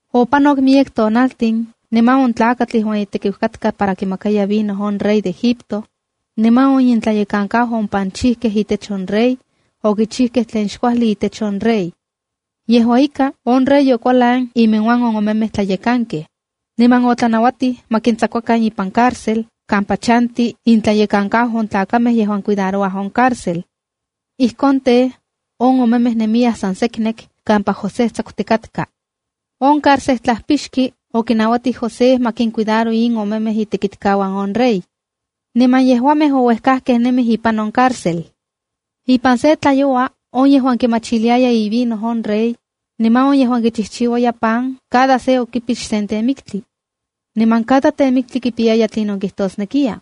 Opanok miyek tonaltin, niman on tlakatl yejuan itekiu katka para kimakaya vino on rey de Egipto, niman on intlayekankau on panchijkej itech on rey, okichijkej tlen xkuajli itech on rey. Yejua ika, on rey okualan inmiuan on omemej tlayekankej, niman otlanauatij ma kintsakuakan ipan carcel kampa chanti intlayekankau on tlakamej yejuan cuidarouaj on carcel. Ijkon tej, on omemej nemiyaj san seknek kampa José tsakutikatka. On carcejtlajpixki okinauatij José ma kincuidaro in omemej itekitkauan on rey. Niman yejuamej ouejkakej nemij ipan on carcel. Ipan sen tlayoua on yejuan kimachiliaya ivino on rey, niman on yejuan kichijchiuaya pan cada se okipix, sen temiktli. Niman cada temiktli kipiyaya tlinon kijtosnekiya.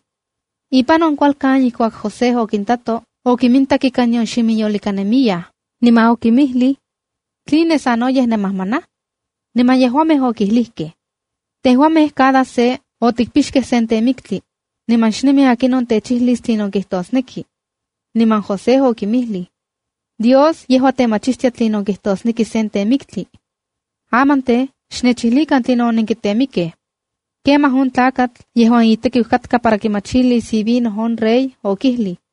Ipan on kualkan ijkuak José okintato, okimintak ika nion ximinyolika nemiyaj, niman okinmijlij: —¿Tline sanoyej nenmajmanaj? Niman yejuamej okilijkej: —Tejuamej cada se otikpixkej sen temiktli, niman xnemi akinon techijlis tlinon kijtosneki. Niman José okinmijlij: —Dios yejua temachistia tlinon kijtosneki sen temiktli. Aman tej, xnechijlikan tlinon onenkitemikej. Kemaj on tlakatl yejuan itekiu katka para kimachilis itlailis on rey okijlij: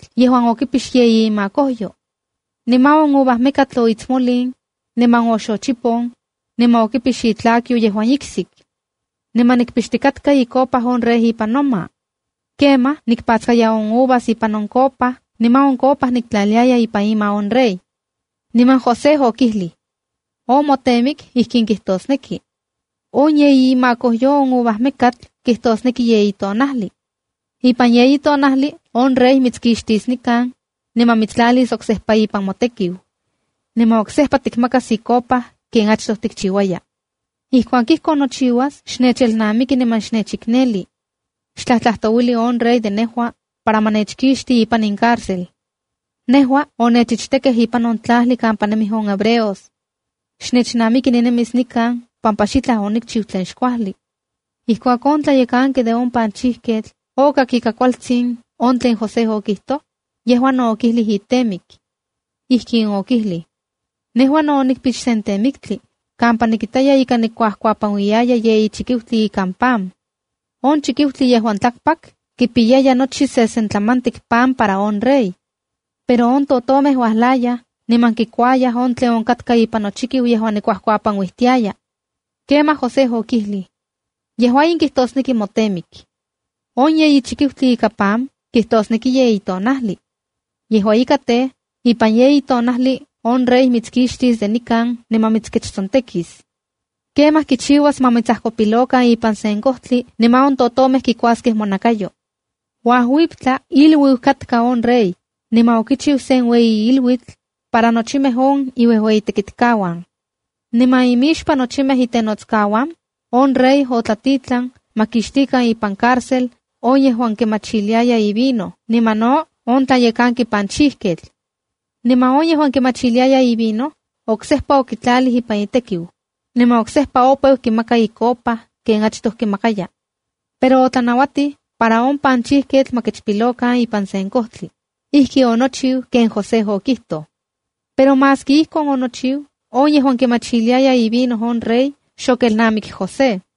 yejuan okipix yeyi imakojyo. Niman on uvajmekatl oitsmolin, niman oxochipon, niman okipix itlakyo yejuan iksik. Nejua nikpixtikatka icopa on rey ipan noma. Kemaj nikpatskaya on uvas ipan on copa niman on copa niktlaliaya ipan ima on rey. Niman José okijlij: —On motemik ijkin kijtosneki. On yeyi imakojyo on ovajmekatl kijtosneki yeyi tonajli. Ipan yeyi tonajli on rey mitskixtis nikan, niman mitstlalis oksejpa ipan motekiu. Niman oksejpa tikmakas icopa ken achtoj tikchiuaya. Ijkuak ijkon nochiuas, xnechelnamiki niman xnechikneli. Xtlajtlajtouili on rey de nejua para ma nechkixti ipan in carcel. Nejua onechichtekej ipan on tlajli kampa nemij hebreos. Xnechnamiki ninemis nikan pampa xitlaj onikchiu tlen xkuajli. Ijkuak on tlayekanki de on panchijkej okak ika kualtsin on tlen José okijtoj, yejua no okijlij itemik. Ijkin okijlij: —Nejua no onikpix sen temiktli kampa nikitaya ika nikuapanuiyaya yeyi chikiutli ikan pan. On chikiutli yejuan tlakpak kipiyaya nochi sesentlamatik pan para on rey. Pero on totomej uajlayaj niman kikuayaj on tlen onkatka ipan nochikiu yejuan nikuapanuijtiaya. Kemaj José okijlij: —Yejua in kijtosneki motemik: On yeyi chikiutli ika pan, kitosneki yeyi tonajli. Yejua ika tej, ipan yeyi tonajli on rey mitskixtis de nikan niman mitskechtsontekis. Kemaj kichiuas ma mitsajkopilokan ipan sen kojtli niman on totomej kuaskej monakayo. Uajuiptla, iluiu katka on rey, niman okichiu sen ueyi iluitl para nochimej on iuejueyitekitkauan. Niman imixpan nochimej itenotskauan, on rey otlatitlan ma kinkixtikan ipan carcel on yejuan kimachiliaya ivino niman no on tlayekanki panchijketl. Niman on yejuan kimachiliaya ivino, oksejpa okitlalij ipan itekiu, niman oksejpa opeu kimaka icopa ken achtoj. Pero otlanauatij para on panchijketl ma kechpilokan ipan sen kojtli. Ijki onochiu ken José okitoj. Pero maski ijkon onochiu, on yejuan kimachiliaya ivino on rey xokelnamik José.